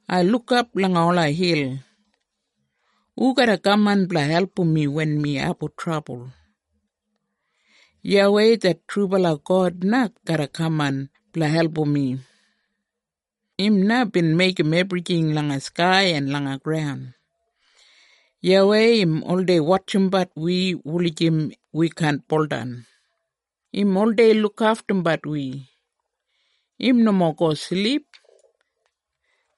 Ai lukap langa ola hil. Hu garra kaman blanga album mi wen mi abum trabul? YAWEI det trubala God na garra kaman blanga album mi. Im na bin meigim ebrijing langa skai en langa graun. YAWEI, im oldei wotjimbat wi wulijim wi kaan buldan. Im oldei lukaftumbat wi. Im nomo go silip.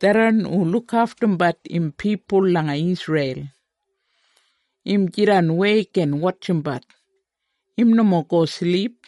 Tharran hu lukaftumbat im pipul langa Isreil, im jidan weik en wotjimbat. Im nomo go silip.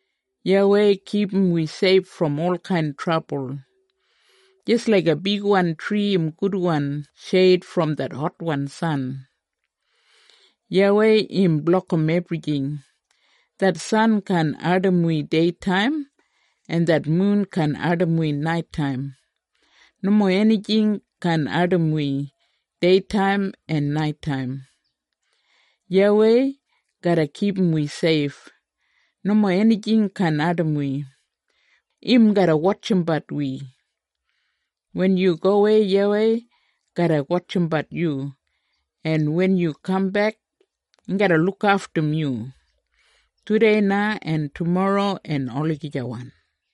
YAWEI kipum wi seif brom olkain trabul, jis laiga bigwan tri im gudwan sheid brom det hotwan san. YAWEI im blokim ebrijing. Det san kaan ardim wi deitaim, en det mun kaan ardim wi naitaim. Nomo enijing kaan ardim wi deitaim en naitaim. YAWEI garra kipum wi seif. Nomo enijing kaan ardim wi. Im garra wotjimbat wi. Wen yu gowei YAWEI garra wotjimbat yu, en wen yu kambek im garra lukaftum yu, tudei na, en tumorro en olagijawan.